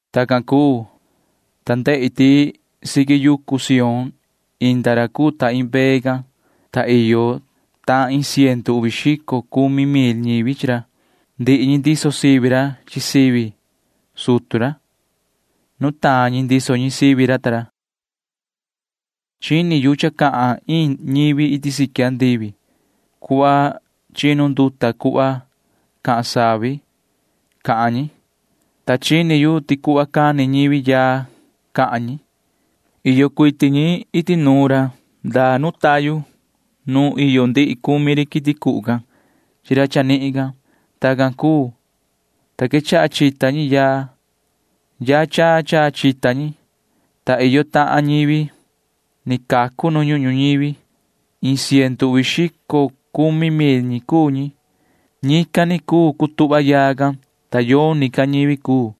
Tacan cuu, ta ndehi ti siqui yucu Sión inda ra cuu ta iin mbee can, ta iyo tahan iin ciendu uvi xico cumi mil ñivi chi ra. Ndihi ñi ndiso sivi ra chi sivi sutu ra. Nutaan ñi ndiso ñi sivi ra ta ra. Chini yu cha cahan iin ñivi iti siqui andivi. Cuhva chinu nduta cuhva cahan savi cahan ñi, ta chini yu ti cuhva cani ñivi yaa cahan ñi. Iyo cuiti ñi iti nuun ra ndaa nu tayu nu iyo ndihi cumi ri quiti cuhu can chi ra chanihin can. Tacan cuu, ta quechaha chita ñi yaa. Yaa chaa chaa chita ñi, ta iyo tahan ñivi ni cacu nu ñuhun ñuñivi. Iin ciendu uvi xico cumi mil ñi cuu ñi. Ñican ni cuu cutuhva yaa can, ta yoni ca ñivi cuu.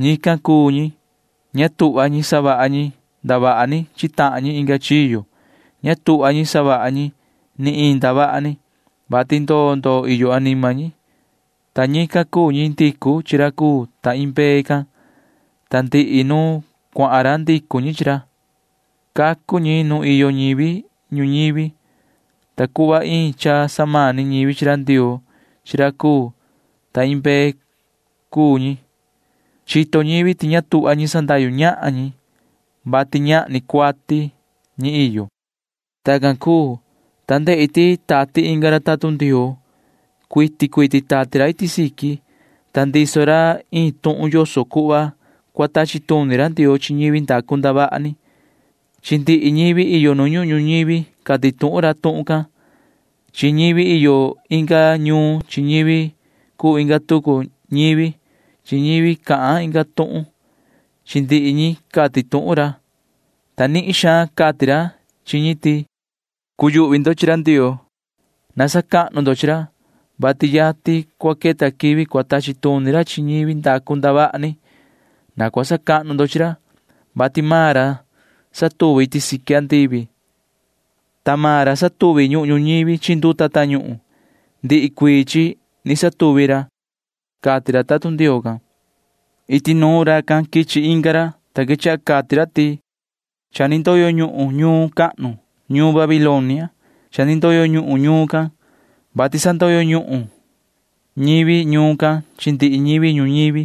Ñican cuu ñi―ña tuhva ñi savaha ñi ndavaha ni chi tahan ñi inga chiyo. Ña tuhva ñi savaha ñi ni iin ndavaha ni, vati ndoo ndoo iyo anima ñi, ta ñican cuu ñi ndicu chi ra cuu ta iin mbee can, ta ndihi nu chahan ra ndicu ñi chi ra. Cacu ñi nu iyo ñivi ñuñivi, ta cuhva iin cha samani ñivi chi ra Ndioo chi ra cuu ta iin mbee cuu ñi. Chito ñivi ti ña tuhva ñi sandahyu ñahan ñi, vati ñahni cuati ñi iyo. Tacan cuu, ta ndehi ti tati inga ra tatun Ndioo. Cuiti cuiti tati ra iti siqui, ta ndiso ra iin tuhun yoso cuhva cua tachi tuni ra Ndioo chi ñivi ndacu ndavaha ni. Chi ndihi ñivi iyo nu ñuhun ñuñivi cati tuhun ra tuhun can. Chi ñivi iyo inga ñuun chi ñivi cuu inga tucu ñivi chi ñivi cahan inga tuhun―chi ndihi ñi cati tuhun ra, ta nihin xaan cati ra chi ñi ti: ―Na cuyuhvi ndo chi ra Ndioo. Na sacahnu ndo chi ra, vati yatin cua queta quivi cua tachi tuni ra chi ñivi ndacu ndavaha ni. Na cua sacahnu ndo chi ra, vati maan ra satuvi iti siqui andivi, ta maan ra satuvi ñuhun ñuñivi chi nduta tañuhun. Ndihi cuii chi ni satuvi ra ―cati ra tatun Ndioo can. Iti nuun racan quichi inga ra, ta quechaha cati ra ti: ―Cha ni ndoyo ñuhun ñuun cahnu―ñuun Babilonia. Cha ni ndoyo ñuhun ñuun can, vati sandoyo ñuhun ñivi ñuun can chi ndihi ñivi ñuñivi,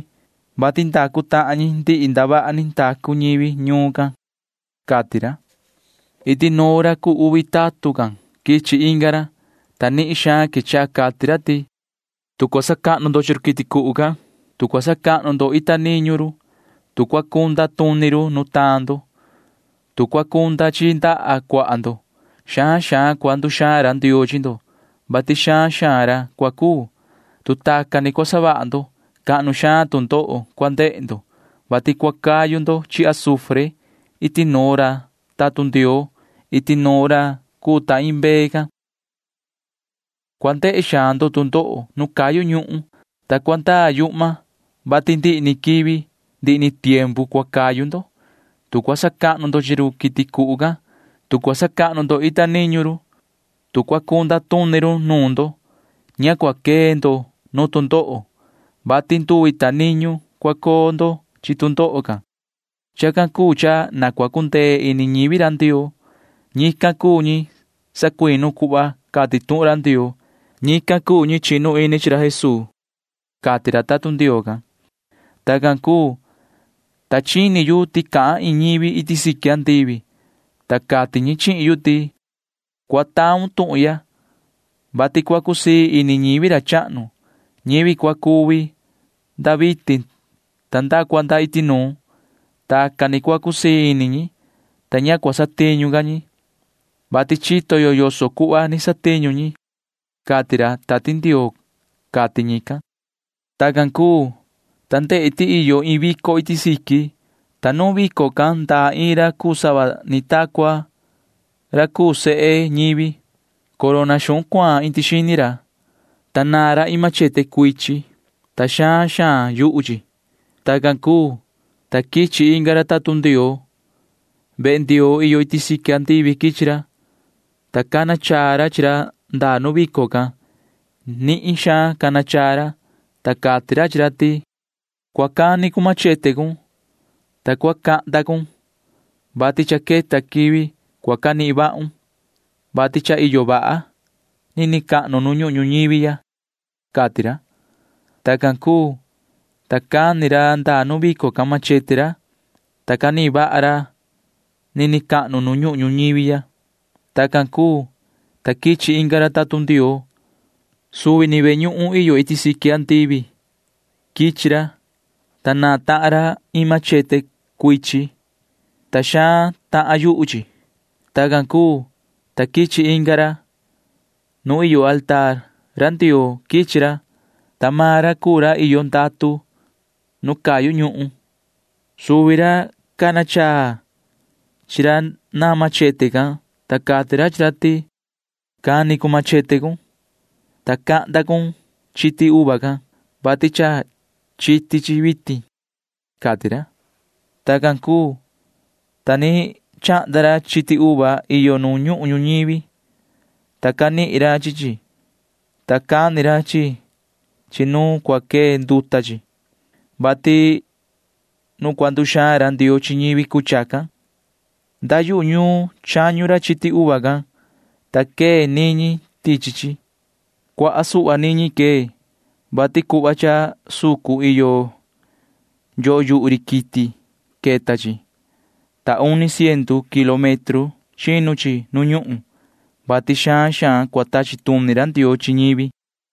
vati ndacu tahan ñi ndihi ndavaha ni ndacu ñivi ñuun can ―cati ra. Iti nuun ra cuu uvi tatun can quichi inga ra, ta nihin xaan quechaha cati ra ti: ―Tu cua sacahnu ndo chi run quiti cuhu can, tu cua sacahnu ndo ita niñu run, tu cua cunda tuni ri nutaan ndo, tu cua cunda chi ndaha cuaha ndo, xaan xaan cua nduxaan ra Ndioo chi ndo, vati xaan xaan ra cua cuu. Tu tacan ni cua savaha ndo, cahnu xaan tu ndoho cua ndehe ndo, vati cua cayu ndo chi azufre iti nuun ra tatun Ndioo iti nuun ra cuu ta iin mbee can. Cua ndehe xaan ndo tu ndoho nu cayu ñuhun, ta cua ndaa yuhma, vati ndihi ni quivi ndihi ni tiempu cua cayu ndo. Tu cua sacahnu ndo chi ri quiti cuhu can, tu cua sacahnu ndo ita niñu ri, tu cua cunda tuni ri nuun ndo, ña cua quee ndo nu tu ndoho, vati nduvi ta niñu cua coo ndo chi tu ndoho can. Chacan cuu cha na cua cundee ini ñivi ra Ndioo. Ñican cuu ñi sacuinu cuhva cati tuhun ra Ndioo. Ñican cuu ñi chinu ini chi ra Jesuu ―cati ra tatun Ndioo can. Tacan cuu, ta chini yu ti cahan iin ñivi iti siqui andivi, ta cati ñi chihin yu ti: ―Cua taun tuhun ya, vati cua cusii ini ñivi ra chahnu―ñivi cua cuvi nda vitin ta nda cua nda iti nuun. Tacan ni cua cusii ini ñi, ta ña cua satiñu ca ñi, vati chito yo yoso cuhva ni satiñu ñi, cati ra Tati Ndioo ―cati ñican. Tacan cuu, ta ndehi ti iyo iin vico iti siqui, ta nuun vico can ndaa iin ra cuu sava ni ta cua ra cuu sehe ñivi. Corona xuhun cuaan indi xini ra, ta naan ra iin machete cuchi, ta xaan xaan yuhu chi. Tacan cuu, ta quichi inga ra tatun Ndioo. Vehe Ndioo iyo iti andivi quichi ra, ta cana chaa ra chi ra ndaa nu vico can. Nihin suhva cana chaa ra, ta cati ra chi ra ti: ―Cua cani cun machete cun, ta cua cahnda cun, vati cha queta quivi cua canihin vahun, vati cha iyo vaha nini cahnu nu ñuhun ñuñivi ya ―cati ra. Tacan cuu, ta cani ra ndaa nu vico can machete ra, ta canihin vaha ra nini cahnu nu ñuhun ñuñivi ya. Tacan cuu, ta quichi inga ra tatun Ndioo. Suvi ni vehe ñuhun iyo iti andivi quichi ra, ta naan tahan ra iin machete cuchi, ta xaan tahan yuhu chi. Tacan cuu, ta quichi inga ra. Nu iyo mesa ra Ndioo quichi ra, ta maan ra cuu ra iyo ndatu nu cayu ñuhun. Suvi ra cana chaa chi ra naan machete can, ta cati ra chi ra ti: ―Cani cun machete cun, ta cahnda cun chiti uva can, vati cha chiti chi vitin ―cati ra. Tacan cuu, ta ni chahnda ra chiti uva iyo nu ñuhun ñuñivi, ta canihin ra chi chi, ta cani ra chi chi nu cua quee nduta chi, vati nu cua nduxaan ra Ndioo chi ñivi cuu chacan. Nda yuhu ñuun chañu ra chiti uva can, ta quee niñi tichi chi. Cuaha suhva niñi quee, vati cuhva cha sucun iyo freno yuhu ri quiti queta chi, ta uni ciendu kilómetro chinu chi nu ñuhun, vati xaan xaan cua tachi tuni ra Ndioo chi ñivi.